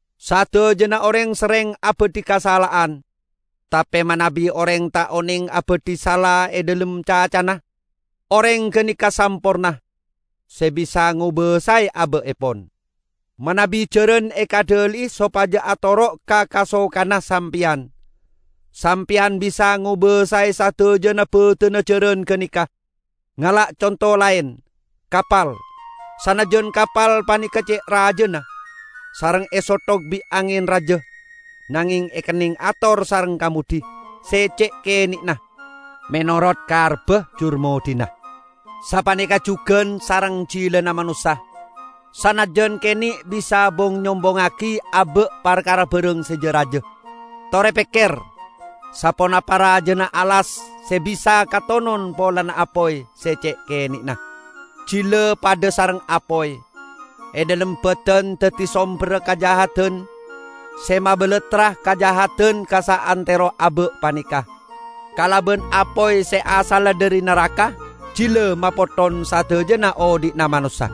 Sadajana oreng serreng abadhi kasala'an. Tape manabi oreng ta' oneng abadhi sala e dhalem cacana, oreng ganeka samporna, se bisa ngobasae aba'epon. Manabi jaran ekaddhali'i sopaja atoro' ka kasokanna sampeyan, sampeyan bisa ngobasae sadajana badanna jaran ganeka. Ngala' conto laen, kapal. Sanajjan kapal paneka ce' rajana, sareng esothok bi' angen raja, nangeng ekenneng ator sareng kamoddhi se ce' kene'na, menorot karebba jurmoddhina. Sapaneka jugan sareng jilana manossa; sanajjan kene' bisa bong-nyombongngagi aba' parkara barang se ja-raja. Tore pekker saponapa rajana alas se bisa katonon polana apoy se ce' kene'na! Jila padha sareng apoy. E dhalem badan daddi somberra kajahadan se mabalattra kajahadan ka saantero aba' paneka. Kalaban apoy se asalla dhari naraka jila mapotthon sadajana odhi'na manossa.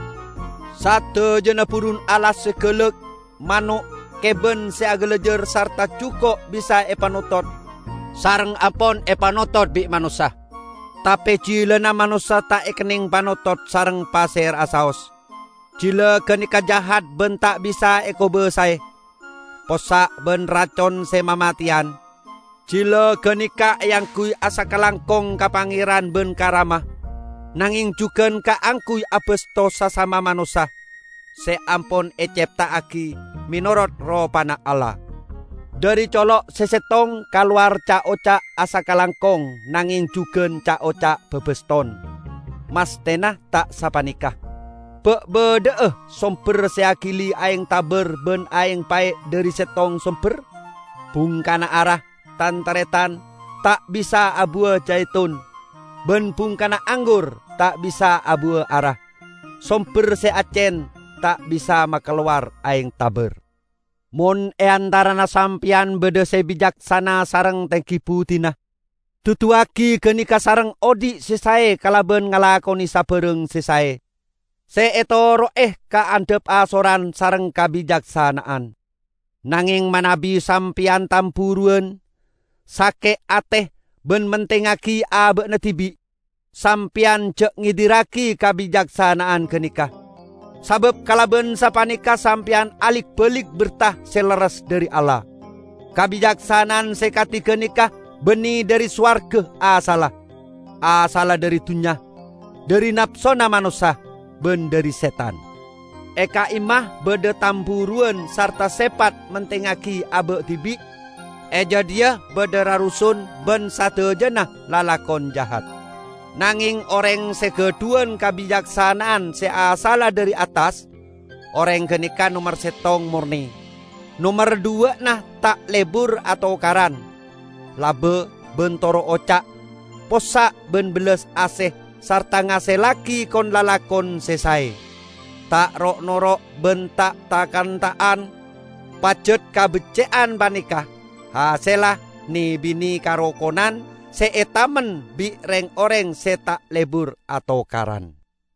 Sadajana burun alas se galak, mano', keban se agalajar sarta juko' bisa epanotot, sareng ampon epanotot bi' manossa. Tape jilana manossa ta' ekenneng panotot sareng pasera'a saos. Jila ganeka jahat ban ta' bisa ekobasae; possa' ban racon se mamateyan. Jila ganeka eangguy asakalangkong ka Pangeran ban ka Rama, nangeng jugan kaangguy abasto sasama manossa, se ampon ecepta'agi menorot ropana Allah. Dhari colo' se settong kalowar ca'-oca' asakalangkong nangeng jugan ca'-oca' babaston. Masthena ta' sapaneka! Ba' badha'a somber se agili aeng tabar ban aeng pae' dhari settong somber? Bungkana ara, tan-taretan, ta' bisa abuwa jaitun, ban bungkana anggur ta' bisa abuwa ara. Somber se accen ta' bisa makalowar aeng tabar. Mon e antarana sampeyan badha se bicaksana sareng tenggi buddina, duduwagi ganeka sareng odhi' se sae kalaban ngalakone sabarang se sae, se etoro'e kaandhapasoran sareng kabicaksana'an. Nangeng manabi sampeyan tamburuwan, sake' ate ban mentingngagi aba'na dibi', sampeyan ja' ngedirragi kabicaksana'an ganeka, sabab kalaban sapaneka sampeyan alik-balik berta se lerres dhari Allah. Kabicaksana'an se kadi ganeka banne dhari sowarga asalla. Asalla dhari dunnya, dhari napsona manossa, ban dhari setan. E ka'imma badha tamburuwan sarta sepat mentingngagi aba' dibi', e gadhiya badha rarusun ban sadajana lalakon jahat. Nangeng oreng se gadhuwan kabicaksana'an se asalla dhari attas, oreng ganeka nomer settong morne; nomer dhuwa'na ta' lebur atokaran, laba ban toro' oca'. Possa' ban bellas ase sarta ngasellagi kon-lalakon se sae. Ta' ro'-noro' ban ta' tha'-kantha'an. Pajat kabecce'an paneka hasella ne-bine karokonan se etamen bi' reng-oreng se ta' lebur atokaran.